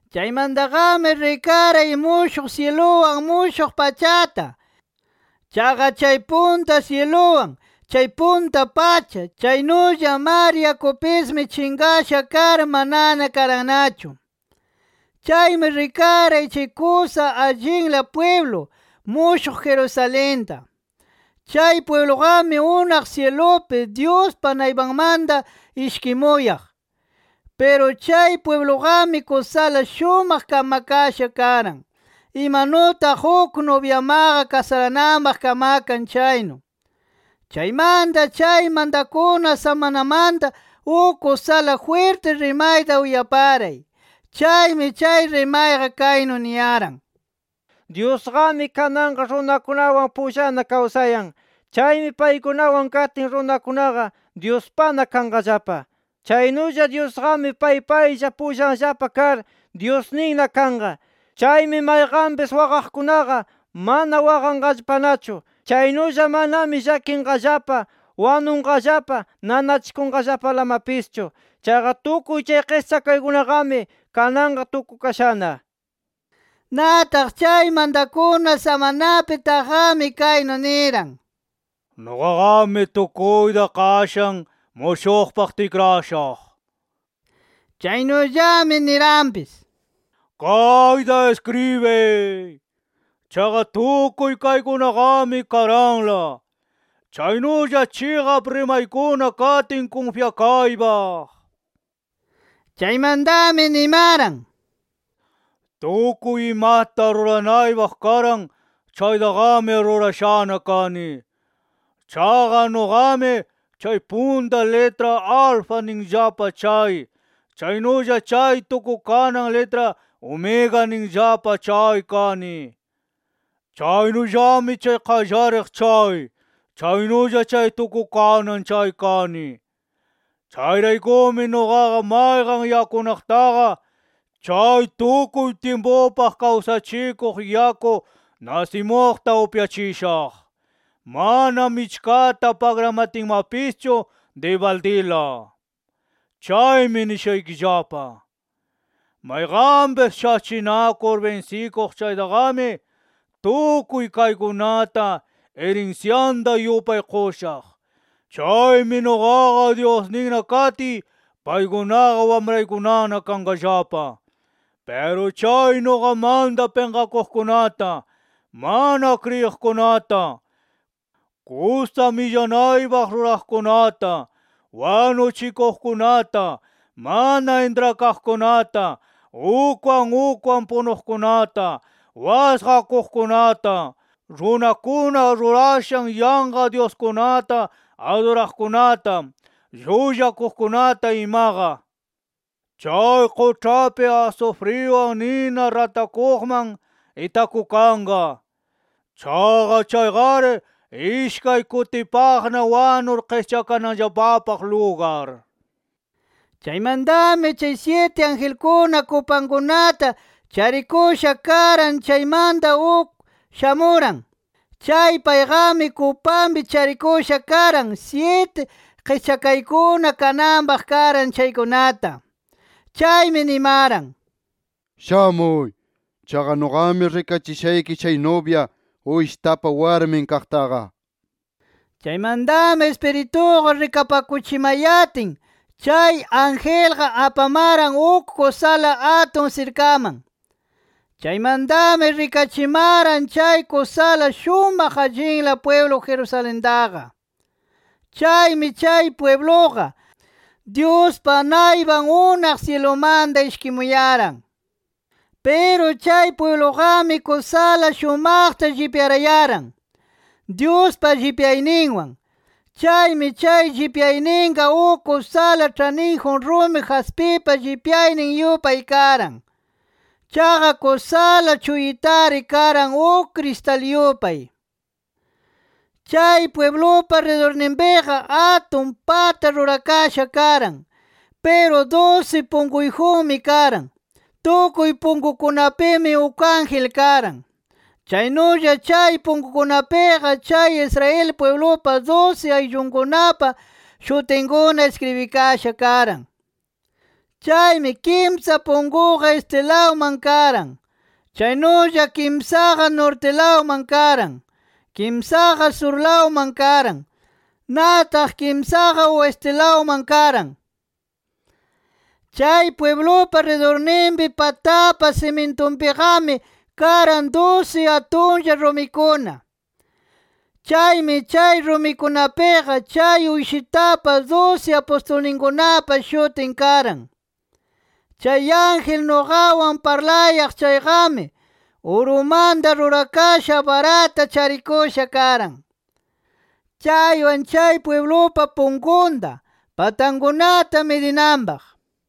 Chaymantaqami rikaray mushuq syiluwan mushuq pachata. Chaqa chay punta syiluwan, chay punta pacha, chaynulla mar yakupismi chinqasha kar, manana karannachu. Chaymi rikaray chay kusa allinla pwiblu, mushuq Jerusalenta. Chay pwibluqami unaq syilupi, Dyuspa naypanmanta ishkimuyaq. Piru chay pwibluqami kusala shumaq kamakasha karan, imanutaq uk nubyamaqa kasarananpaq kamakan chaynu. Chaymanta chay mantakuna samanamanta uk kusala jwirti rimayta uyaparay. Chaymi chay rimayqa kaynu niyaran: “Dyusqami kananqa runakunawan pullana kawsayan. Chaymi paykunawan katin, runakunaqa Dyuspana kanqallapa. Chaynulla Dyusqami pay paylla pullanllapa kar Dyusninna kanqa. Chaymi mayqanpis waqaqkunaqa mana waqanqallapanachu. Chaynulla manami llakinqallapa, wanunqallapa, nanachikunqallapalamapischu. Chaqa tukuy chay qischakaykunaqami kananqa tukukashana” nir. Nataq chay mantakuna samanapi taqqami, kaynu niran: “Nuqaqami tukuyta qashan mushuqpaq tikrashaq”. Chaynullami niranpis: “¡Kayta iskribiy! Chaqa tukuy kaykunaqami karanla, chaynulla chiqap rimaykuna katin kunfyakaypaq” nir. Chaymantami nimaran: “Tukuy imata ruranaypaq karan chaytaqami rurashana kani. Chaqa nuqami chay punta litra Alfa ninllapa chay, chaynulla chay tukukanan litra Omega ninllapa chay kani. Chaynullami chay Qallariq chay, chaynulla chay Tukukanan chay kani. Chayraykumi nuqaqa mayqan yakunaqtaqa, chay tukuy tyimpupaq kawsachikuq yaku nasimuqta upyachishaq, mana michkata pagramatinmapischu dibaldila. Chaymi nishaykillapa: Mayqanpis shachinakur binsikuq chaytaqami, tukuy kaykunata irinsyanta yupay qushaq. Chaymi nuqaqa Dyusninna katiy, paykunaqa wamraykunana kanqallapa. Piru chay nuqamanta pinqakuqkunata, mana kriyiqkunata, kusa millanaypaq ruraqkunata, wanuchikuqkunata, mana intrakaqkunata, ukwan ukwan punuqkunata, wasqakuqkunata, runakuna rurashan yanqa dyuskunata aduraqkunata, llullakuqkunata imaqa, chay quĉhapi asufriwan nina ratakuqman itakukanqa. Chaqa chayqari ishkay kutipaqna wanur qischakananllapapaq lugar” nir. Chaymantami chay syiti angelkuna kupankunata charikusha karan chaymanta uk shamuran. Chay payqami kupanpi charikusha karan, syiti qischakaykuna kananpaq karan chaykunata. Chaymi nimaran: “¡Shamuy! Chaqa nuqami rikachishayki chay nubya, Uyshitapa warmin kaqtaqa” nir. Chaymantami Ispirituqa rikapakuchimayatin, chay angelqa apamaran uk kusala atun sirkaman. Chaymantami rikachimaran chay kusala shumaq allinla pwiblu Jerusalentaqa. Chaymi chay pwibluqa, Dyuspa naypan unaq syilumanta ishkimuyaran. Piru chay pwibluqami kusala shumaqta llipyarayaran, Dyuspa llipyayninwan. Chaymi chay llipyayninqa uk kusala ĉhaniyjun rumi jaspipa llipyaynin yupay karan. Chaqa kusala chuyitari karan uk kristal yupay. Chay pwiblupa ridurninpiqa, atun pata rurakasha karan. Piru dusi punkuyjunmi karan. Tukuy punkukunapimi, uk ángel karan. Chaynulla chay punkukunapiqa, chay Israel pwiblupa dusi ayllukunapa shutinkuna iskribikasha karan. Chaymi kimsa punkuqa, estilawman karan. Chaynulla kimsaqa, nortilawman karan. Kimsaqa surlawman karan. Nataq kimsaqa, oestilawman karan. Chay pwiblupa ridurninpi patapa simintunpiqami, karan dusi atunlla rumikuna. Chaymi chay rumikunapiqa, chay Uyshitapa dusi apustulninkunapa shutin karan. Chay ángel nuqawan parlayaq chayqami, urumanta rurakasha barata charikusha karan, chaywan chay pwiblupa punkunta, patankunata midinanpaq.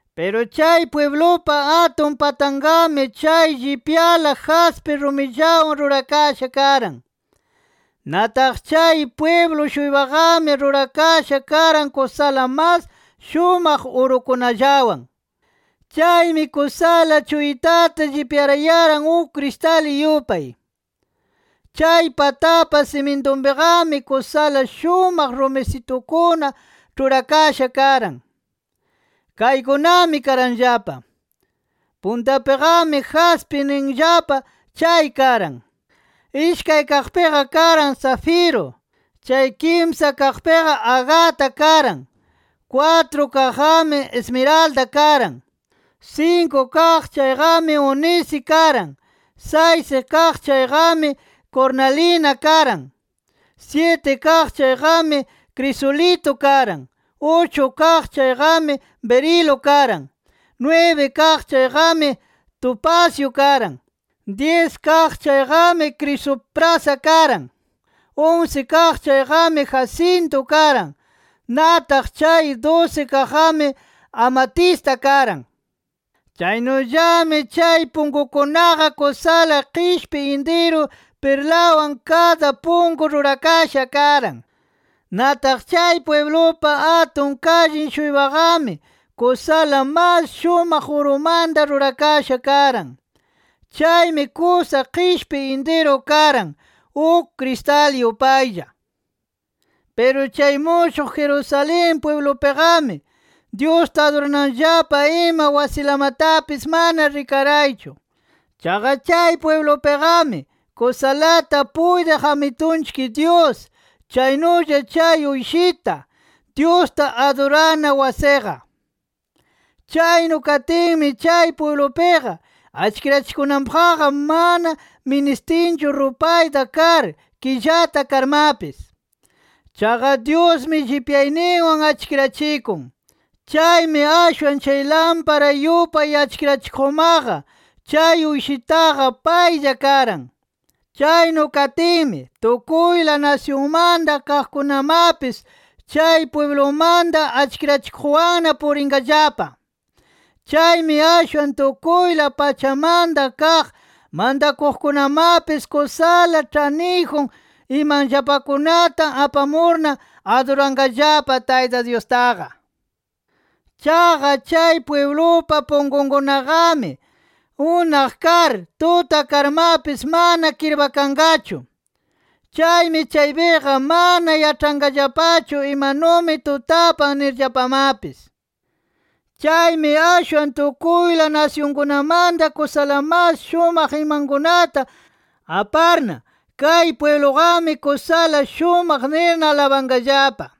Piru chay pwiblupa atun patanqami chay llipyala jaspi rumillawan rurakasha karan. Nataq chay pwiblu-shuypaqami, rurakasha karan kusala mas shumaq urukunallawan. Chaymi kusala chuyitata llipyarayaran uk kristal yupay. Chay patapa simintunpiqami, kusala shumaq rumisitukuna ĉhurakasha karan. Kaykunami karanllapa: Puntapiqami jaspi ninllapa chay karan. Ishkay kaqpiqa karan safiru. Chay kimsa kaqpiqa, agata karan. Kwatru kaqqami, ismiralda karan. Sinku kaq chayqami, únisi karan. Saysi kaq chayqami, kurnalina karan. Syiti kaq chayqami, krisulitu karan. Uchu kaq chayqami, birilu karan. Nwibi kaq chayqami tupasyu karan. Dyis kaq chayqami krisuprasa karan. Unsi kaq chayqami, jasintu karan. Nataq chay dusi kaqqami, amatista karan. Chaynullami chay punkunkunaqa kusala qishpi intiru pirlawan kada punku rurakasha karan. Nataq chay pwiblupa atun kallin-shuypaqami, kusala mas shumaq urumanta rurakasha karan. Chaymi kusa qishpi intiru karan, uk kristal yupaylla. Piru chay mushuq Jerusalén pwiblupiqami, Dyusta adurananllapa ima wasilamatapis mana rikaraychu. Chaqa chay pwiblupiqami, kusalata puytiq Amitunchik Dyus, chaynulla chay Uyshita, Dyusta adurana wasiqa. Chaynu katinmi chay pwiblupiqa achkirachikunanpaqqa, mana ministinchu rupayta kar, killata karmapis. Chaqa Dyusmi llipyayninwan achkirachikun. Chaymi ashwan chay lampara yupay achkirachikuqmaqa, chay Uyshitaqa paylla karan. Chaynu katinmi, tukuyla nasyunmanta kaqkunamapis chay pwiblumanta achkirachikuqwanna purinqallapa. Chaymi ashwan tukuyla pachamanta kaq mantakuqkunamapis kusala ĉhaniyjun imanllapakunata apamurna aduranqallapa Tayta Dyustaqa. Chaqa chay pwiblupa punkunkunaqami, unaq kar tuta karmapis, mana kirpakanqachu. Chaymi chaypiqa mana yaĉhanqallapachu imanumi tutapan nirllapamapis. Chaymi ashwan tukuyla nasyunkunamanta kusala mas shumaq imankunata aparna, kay pwibluqami kusala shumaq nirna alabanqallapa.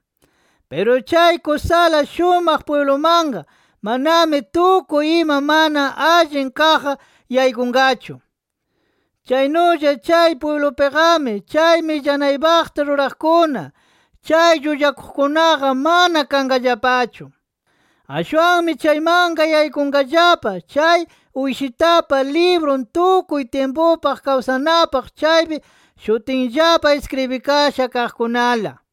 Piru chay kusala shumaq pwiblumanqa manami tukuy ima mana allin kaqqa yaykunqachu. Chaynulla chay pwiblupiqami chay millanaypaqta ruraqkuna, chay llullakuqkunaqa mana kanqallapachu. Ashwanmi chaymanqa yaykunqallapa chay Uyshitapa librun tukuy tyimpupaq kawsanapaq chaypi shutinllapa iskribikasha kaqkunala.